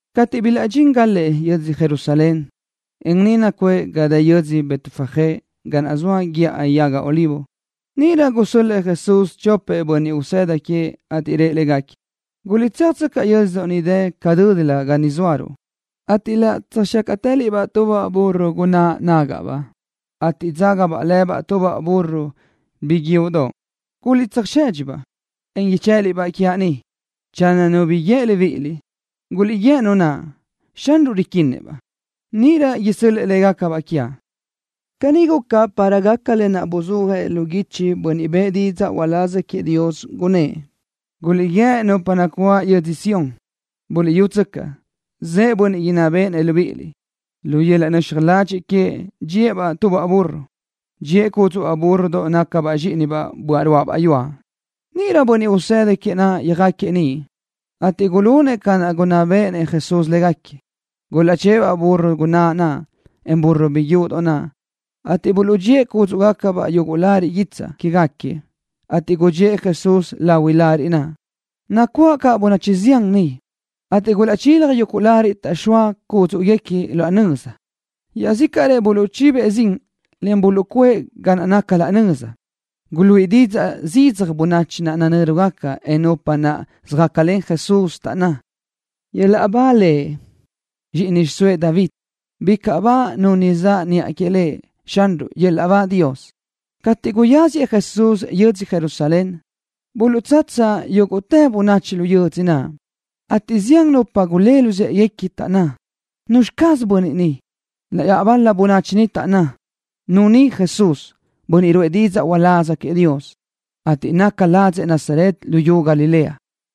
Cateʼ bilaʼdxíngalëʼ yödzö Jerusalén, en niʼ nacuʼë ga dë yödzö Betfagé ga naʼ zoa Guíʼa Yaga Olivo, níʼirö gusö́l-lëʼë Jesús chopëʼ bönniʼ usëda queëʼ, ateʼ rëʼ légaquiëʼ: —Guliʼtséajtsöcaʼ yö́dzödoʼ niʼ ca dö́dilö ga ni zóaruʼ, ateʼ laʼ tsöjxácaʼtëliʼ-baʼ tubaʼ burro gunáʼ nágaʼbaʼ, ateʼ dzaga lëbaʼ tubaʼ burro biguiúʼdoʼ. Guliʼtsöjsedxi-baʼ, en ichë́ʼëliʼ-baʼ quiaʼ ni. Channö nu bi guíë libíʼiliʼ, guliʼguíë nu naʼ: “Xanruʼ riquinnëʼ-baʼ.” Níʼirö isö́l-lëʼë légacabaʼ quiaʼ. Caní guca para gaca lë naʼ buzúajëʼ lu guichi bönniʼ bëʼë didzaʼ uláz queëʼ Dios, gunnë́ʼ: Guliʼguíë nupa nacuáʼ yödzö Sión, Buliʼyútsöcaʼ, zëʼë Bönniʼ inná béʼenëʼ libíʼiliʼ. Lu yöl-laʼ nöxaj ladxiʼ queëʼ dxíëʼ-baʼ tubaʼ burro. Dxíëʼ cúdzuʼbaʼ búrrodoʼ nácabaʼ zxíʼinibaʼ böaʼ ruáʼabaʼ yuaʼ. Níʼirö bönniʼ usëda queëʼ yöjáquiëʼ niʼ, ateʼ gulunëʼ ca naʼ gunná béʼenëʼ Jesús légaquiëʼ. Gulaʼchë́ʼë-baʼ burro gunáʼ naʼ, en burro biguiúʼdoʼ naʼ, ateʼ buluʼdxíëʼ cúdzuʼgacabaʼ yuguʼ lariʼ guitsaʼ quégaquiëʼ, ateʼ gudxíëʼ Jesús lahuiʼ lariʼ naʼ. Nacuáʼ caʼ bönachi zián niʼ, ateʼ gulaʼchilaj yuguʼ lariʼ taʼxóa cúdzuʼguequi laʼ nöza. Iaʼzícaʼrëʼ buluʼchibëʼ zin le buluʼzxóëʼ ga naca laʼ nöza. Guluíʼi zidzaj didzaʼ bönachi naʼ nanö́rugaca, en nupa naʼ söjácalen Jesús, taʼnná: —¡Yöl-laʼ ba Lëʼ, zxíʼini xiʼsóëʼ David! ¡Bicaʼ ba nu ni zaʼ niʼa que Lëʼ Xanruʼ! ¡Yöl-laʼ ba Dios! Cateʼ guyáziëʼ Jesús yödzö Jerusalén, buluʼdzatsa yúguʼtë bönachi lu yödzö naʼ, ateʼ zián nupa gulë́ luzë́ʼeguequi, taʼnná: —¿Nuzxi caz bönniʼ ni? Iaʼbal-la bönachi niʼ taʼnná: —Nu ni Jesús, bönniʼ ruʼë didzaʼ uláz queëʼ Dios, ateʼ naca ladzëʼ Nazaret luyú Galilea.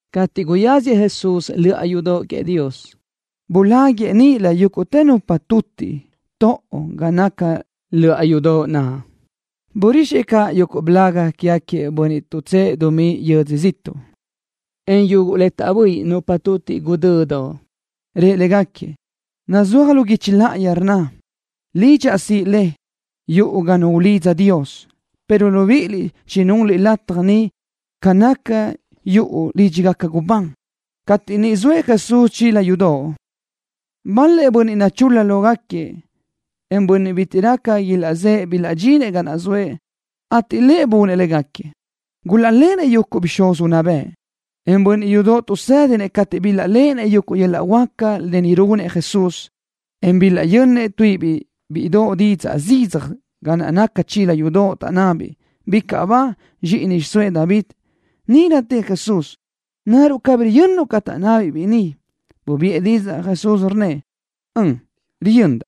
Cateʼ guyáziëʼ Jesús löʼa yudoʼ queëʼ Dios, buláguiʼë níʼilö yúguʼtë nupa tutiʼ toʼo ga naca löʼa yudoʼ naʼ. Burixëʼ caʼ yuguʼ blaga quégaquiëʼ bönniʼ tuʼtsë́ʼë dumí yödzö ziʼtuʼ, en yuguʼ le taʼböʼi nupa tutiʼ guʼdödoʼ. Rëʼ légaquiëʼ: —Nazúaj lu guichi láʼayi le rnna: “Lidxaʼ siʼi le, yuʼu ga nu ulidza Dios”, pero libíʼiliʼ chinunliʼ lataj ni ca naca yuʼu lídxigaca gubán. Cateʼ niʼ zoëʼ Jesús chila yudoʼ, bal-lëʼ bönniʼ nachul-la lógaquiëʼ, en bönniʼ bitiʼ raca ilaʼzë́ʼë bilaʼdxinëʼ ga naʼ zoëʼ, ateʼ Lëʼ bunëʼ légaquiëʼ. Gulaʼlenëʼ yuguʼ bixúz unná bëʼ, en bönniʼ yudoʼ tuʼsédinëʼ cateʼ bilaʼléʼenëʼ yuguʼ yöl-laʼ huáca ni runëʼ Jesús, en bilaʼyönnëʼ tuíʼibiʼ bíʼidoʼ zidzaj didzaʼ ga naca chila yudoʼ, taʼnnabiʼ: —¡Bicaʼ ba Lëʼ, zxíʼini xiʼsóëʼ David! Níʼirö tëʼ Jesús: —¿Naruʼ cabí riyönnuʼ ca taʼnnabiʼ biʼi ni? Bubiʼë didzaʼ Jesús, rnnëʼ: —Ön, riyöndaʼ.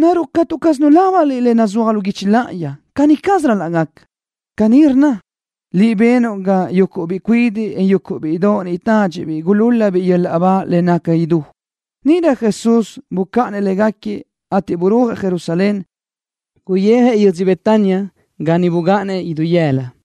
¿Naruʼ catu caz nulábaniliʼ le nazúaj lu guichi láʼayi caní caz ral-laʼ gaca? Caní rnna: “Liʼ benuʼ ga yuguʼ biʼi cuidiʼ, en yuguʼ bíʼidoʼ niʼ tádxiʼbiʼ gulúl-labiʼ yöl-laʼ ba le naca idú.” Níʼirö Jesús bucáʼanëʼ légaquiëʼ, ateʼ burúajëʼ Jerusalén. Guyijëʼ yödzö Betania ga niʼ bugáʼanëʼ idú yëla.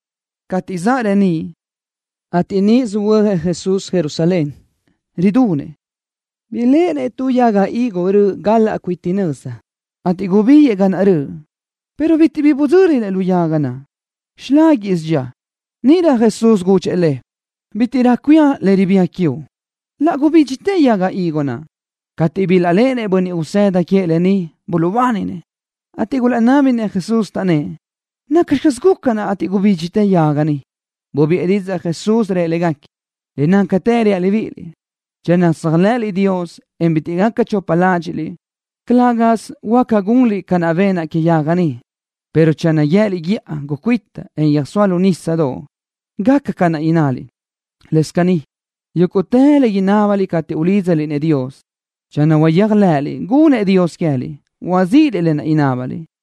Cateʼ zaʼ reníʼ, ateʼ niʼ söhuö́jëʼ Jesús Jerusalén, ridunëʼ. Biléʼenëʼ tu yaga higo röʼ gal-laʼ cuite nöza, ateʼ gubíguiʼë ga naʼ röʼ, pero bitiʼ bi bidzö́linëʼ lu yaga naʼ. Xiláguiʼsö dxía. Níʼirö Jesús gudxëʼ le: —Bítiʼrö cuía le ribía quiuʼ. Laʼ gubídxitë yaga higo naʼ. Cateʼ bilaʼléʼenëʼ bönniʼ usëda queëʼ lë ni, buluʼbáninëʼ, ateʼ gulaʼnábinëʼ Jesús, taʼnnë́ʼ: —¿Nacxi caz guca, gubídxitë yaga ni? Bubiʼë didzaʼ Jesús, rëʼ légaquiëʼ: —Le nácatë reaʼ libíʼiliʼ, channö tséajlëʼëliʼ Dios, en bitiʼ gaca chopa ládxiʼliʼ, calë́gasö huáca gunliʼ ca naʼ benaʼ que yaga ni, pero channö guië́liʼ guíʼa ni: Gucuíta, en yöjsóa lu nísadoʼ, gaca ca naʼ innaliʼ. Lëscaʼ caní, yúguʼtë le inábaliʼ cateʼ ulídzaliʼ-nëʼ Dios, channö huayéjlëʼëliʼ gunnëʼ Dios queë́liʼ, huazíʼiliʼ lë naʼ inábaliʼ.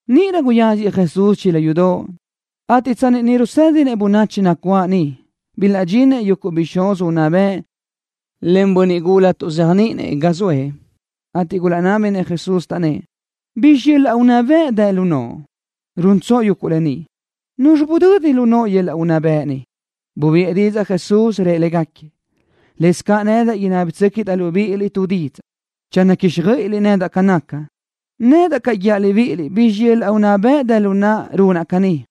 Níʼirö guyáziëʼ Jesús chila yudoʼ, ateʼ tsanni niʼ rusédinëʼ bönachi nacuáʼ niʼ, bilaʼdxinëʼ yuguʼ bixúz unná bëʼ len bönniʼ gula tuʼzéajniʼinëʼ ga zoëʼ, ateʼ gulaʼnábinëʼ Jesús, taʼnnë́ʼ: —¿Bizxi yöl-laʼ unná bëʼ dë lu noʼo, runtsoʼ yuguʼ lë ni? ¿Nuzxi budödi lu noʼo yöl-laʼ unná bëʼ ni? Bubiʼë didzaʼ Jesús, rëʼ légaquiëʼ: —Lëscaʼ nedaʼ inábatsöquiʼdaʼ libíʼiliʼ tu didzaʼ. Channö quíxjöiʼiliʼ nedaʼ ca naca, nedaʼ caʼ guíaʼ libíʼiliʼ bizxi yöl-laʼ unná bëʼ dë lu naʼa runaʼ caní.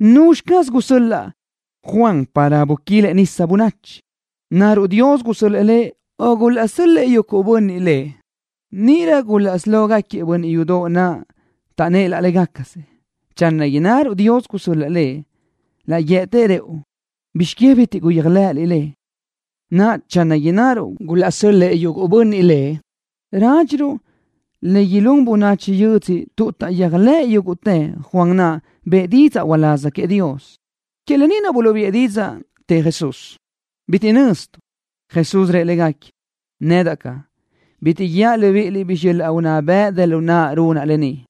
¿Nuzxi caz gusöl-laʼ Juan para buquilëʼ bönachi nisa? ¿Naruʼ Dios gusö́l-lëʼë lëʼ, o gulaʼsö́l-lëʼë yuguʼ bönniʼ lëʼ? Níʼirö gulaʼsí lógaquiëʼ bönniʼ yudoʼ naʼ taʼnnë́ʼ laʼ légacasëʼ: —Channö innaruʼ: Dios gusö́l-lëʼë lëʼ, laʼ guië́tëʼ rëʼu: “¿Bizx que bitiʼ guyéajlëʼëliʼ lëʼ?” Naʼa, channö innaruʼ: Gulaʼsö́l-lëʼë yuguʼ bönniʼ lëʼ, rádxiruʼ le ilún bönachi lu yödzö tuʼ taʼyéajlëʼë yúguʼtëʼ Juan naʼ bëʼë didzaʼ uláz queëʼ Dios. Que lë ni naʼ buluʼbiʼë didzaʼ, tëʼ Jesús: —Bitiʼ nöztuʼ. Jesús rëʼ légaquiëʼ: —Nedaʼ caʼ, bitiʼ guíaʼ libíʼiliʼ bizxi yöl-laʼ unná bëʼ dë lu naʼa runaʼ lë ni.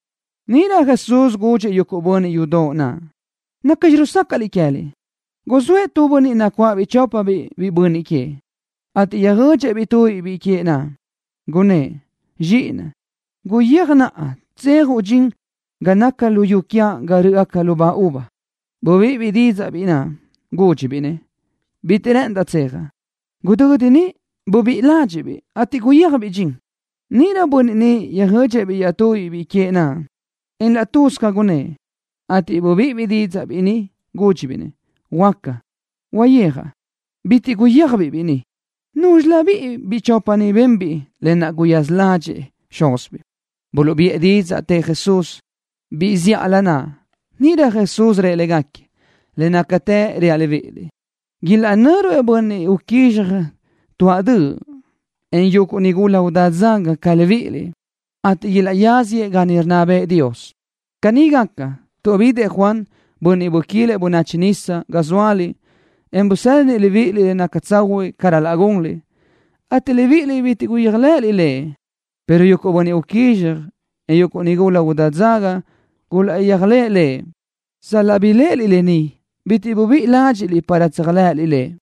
Níʼirö Jesús gudxëʼ yuguʼ bönniʼ yudoʼ naʼ: —¿Nacxi rusácaʼliʼ queë́liʼ? Guzóëʼ tu bönniʼ nacuáʼabiʼ chópabiʼ biʼi bönniʼ queëʼ, ateʼ yöjödxëʼ-biʼ tubiʼ biʼi queëʼ naʼ, gunnë́ʼ: “Zxíʼinaʼ, guyéaj naʼa tsöjenuʼ dxin ga naca luyú quiaʼ ga rö́ʼgaca lubá uva.” Bubíʼibiʼ didzaʼ biʼi naʼ, gúdxibiʼ-nëʼ: “Bitiʼ rë́ʼëndaʼ tsejaʼ.” Gudödi niʼ bubíʼi ládxiʼbiʼ, ateʼ yöjenbiʼ dxin. Níʼirö bönniʼ naʼ yöjödxëʼ-biʼ iaʼtubiʼ biʼi queëʼ naʼ, en laʼ tuz ca gunnë́ʼ, ateʼ bubíʼibiʼ didzaʼ biʼi ni, gúdxibiʼ-nëʼ: “Huaca, Dad. Uyéajaʼ.” Bitiʼ guyéajbiʼ biʼi ni. ¿Núzxilöbiʼ biʼi chopa ni benbiʼ le guyaza ládxëʼë xúzibiʼ? Buluʼbiʼë didzaʼ, tëʼ Jesús: —Biʼi zíʼalö naʼ. Níʼirö Jesús rëʼ légaquiëʼ: —Le nácatë reaʼ libíʼiliʼ, ilaʼnö́ruëʼ bönniʼ uquízxaj tuáʼ döʼ, en yuguʼ nigula udá dzaga ca libíʼiliʼ, ateʼ ilaʼyáziëʼ ga niʼ rinná bëʼë Dios. Caní gaca, tuʼ bidëʼ Juan, bönniʼ buquilëʼ bönachi nisa, ga zóaliʼ, en busédinëʼ libíʼiliʼ le naca tsahuiʼ ca ral-laʼ gunliʼ, ateʼ libíʼiliʼ bitiʼ guyéajlëʼëliʼ lëʼ, pero yuguʼ bönniʼ uquízxaj, en yuguʼ nigula udá dzaga gulaʼyéajlëʼë lëʼ. Sal-laʼ biléʼeliʼ lë ni, bitiʼ bubíʼi ládxiʼliʼ para tséajlëʼëliʼ lëʼ.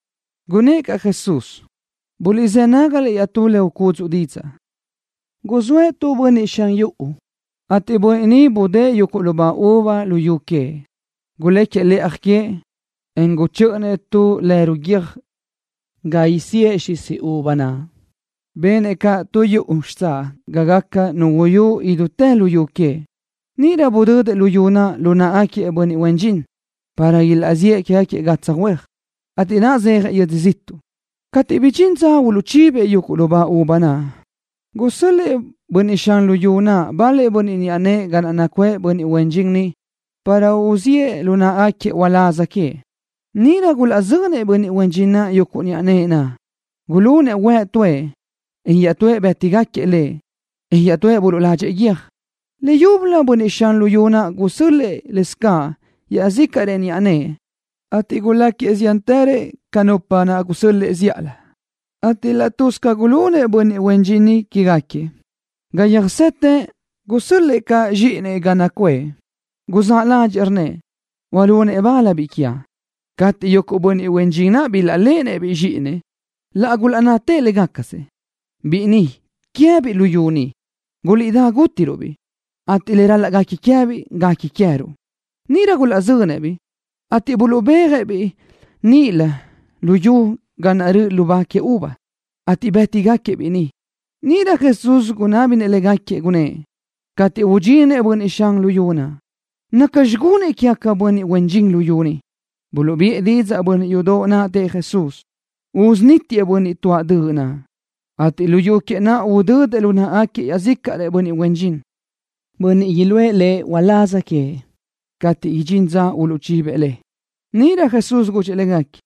Gunnë́ʼ caʼ Jesús: —Buliʼzë́ nágaliʼ iaʼtú le ucúdzuʼa didzaʼ. Guzóëʼ tu bönniʼ xan yuʼu, ateʼ bönniʼ ni budë́ʼë yuguʼ lubá uva luyú queëʼ. Guléquiëʼ lëʼaj que, en guchö́ʼönëʼ tu lerui guiö́j ga isíëʼ xisi uva naʼ. Benëʼ caʼ tu yuʼu xitsáʼ ga gaca nu uyú idútë luyú queëʼ. Níʼirö budödëʼ luyú naʼ lu náʼagaquiëʼ bönniʼ huen dxin, para ilaʼziʼë quégaquiëʼ gatsaj huéaj, ateʼ saʼyéajëʼ yödzö ziʼtuʼ. ’Cateʼ chibidxín dza uluʼchibëʼ yuguʼ lubá uva naʼ, gusö́l-lëʼë bönniʼ xan luyú naʼ bal-lëʼ niʼa nëʼë ga naʼ nacuʼë bönniʼ huen dxin niʼ para uluʼziʼë lu náʼagaquiëʼ uláz queëʼ. Níʼirö gulaʼzönëʼ bönniʼ huen dxin naʼ yuguʼ niʼa nëʼë naʼ. Gulunëʼ huëʼ tuëʼ, en iaʼtúëʼ bë́tigaquiëʼ lëʼ, en iaʼtúëʼ buluʼladxëʼ lëʼ guiö́j. Leyúbölö bönniʼ xan luyú naʼ gusö́l-lëʼë caʼ iaʼzícaʼrëʼ niʼa nëʼë, ateʼ guláquiëʼ ziántërëʼ ca nupa naʼ gusö́l-lëʼë zíʼalö, ateʼ laʼ tuz ca gulunëʼ bönniʼ huen dxin niʼ quégaquiëʼ. ’Ga yöjsete, gusö́l-lëʼë caʼ zxíʼinëʼ ga naʼ nacuʼë. Guzáʼ ládxëʼë, rnnëʼ: Hualunëʼ bal biʼi quiaʼ. Cateʼ yuguʼ bönniʼ huen dxin naʼ bilaʼléʼenëʼ-biʼ zxíʼinëʼ, laʼ gulaʼnnatëʼ laʼ légacasëʼ: “Biʼi ni guequi queë́biʼ luyú ni. Guliʼdá, gútiruʼ-biʼ, ateʼ le ral-laʼ guequi queë́biʼ guequi queë́ruʼ.” Níʼirö gulaʼzönëʼ-biʼ, ateʼ buluʼbéajëʼ-biʼ níʼilö luyú ga naʼ rö́ʼgaca lubá uva, ateʼ bë́tigaquiëʼ-biʼ niʼ. Níʼirö Jesús gunábinëʼ légaquiëʼ, gunnë́ʼ: —Cateʼ udxinëʼ bönniʼ xan luyú naʼ, ¿nacxi gunëʼ quégaquiëʼ bönniʼ huen dxin niʼ? Buluʼbiʼë didzaʼ bönniʼ yudoʼ naʼ, tëʼ Jesús: —Usunítiëʼ bönniʼ tuáʼ döʼ naʼ, ateʼ luyú queëʼ naʼ udödëʼ lu náʼagaquiëʼ iaʼzícaʼrëʼ bönniʼ huen dxin, bönniʼ iluʼë lëʼ uláz queëʼ cateʼ idxín dza uluʼchibëʼ le. Níʼirö Jesús gudxëʼ légaquiëʼ: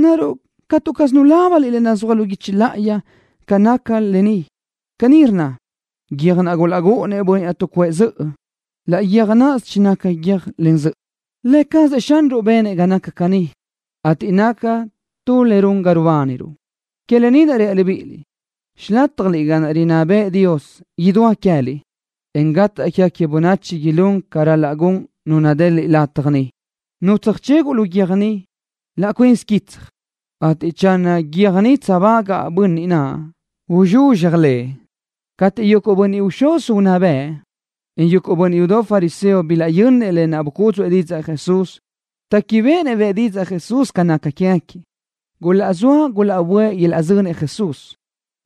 —¿Naruʼ catu caz nulábaniliʼ lë naʼ nazúaj lu guichi láʼayi ca naca lë ni? Caní rnna: Guiö́j naʼ gulaʼrúʼunëʼ bönniʼ tuʼcuʼë zöʼö, laʼ guiö́j náʼasö chinaca guiö́j len zöʼö. Lë cazëʼ Xanruʼ benëʼ ga naca caní, ateʼ naca tu le run ga rubániruʼ. ’Que lë ni naʼ reaʼ libíʼiliʼ, xilátjaliʼ ga naʼ rinná bëʼë Dios idúa queë́liʼ, en gataʼ quégaca bönachi ilún ca ral-laʼ gun nu nadeliʼ lataj niʼ. Nu tsöjcheguʼ lu guiö́j ni, laʼ cuinsi quitsaj, ateʼ channö guiö́j ni tseajbagaʼ bönniʼ naʼ, uzxuzxaj lëʼ. Cateʼ yuguʼ bixúz unná bëʼ, en yuguʼ bönniʼ yudoʼ fariseo bilaʼyönnëʼ lë naʼ bucúdzuʼë didzaʼ Jesús, téquibeʼenëʼ bëʼë Jesús didzaʼ ca naca quégaquiëʼ. Gulaʼzóa gulaʼböʼë ilaʼzönëʼ Jesús,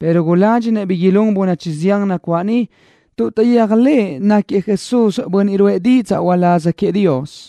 pero guládxinëʼ bi ilún bönachi zián nacuáʼ niʼ tuʼ taʼyéajlëʼ náquiëʼ Jesús bönniʼ ruʼë didzaʼ uláz queëʼ Dios.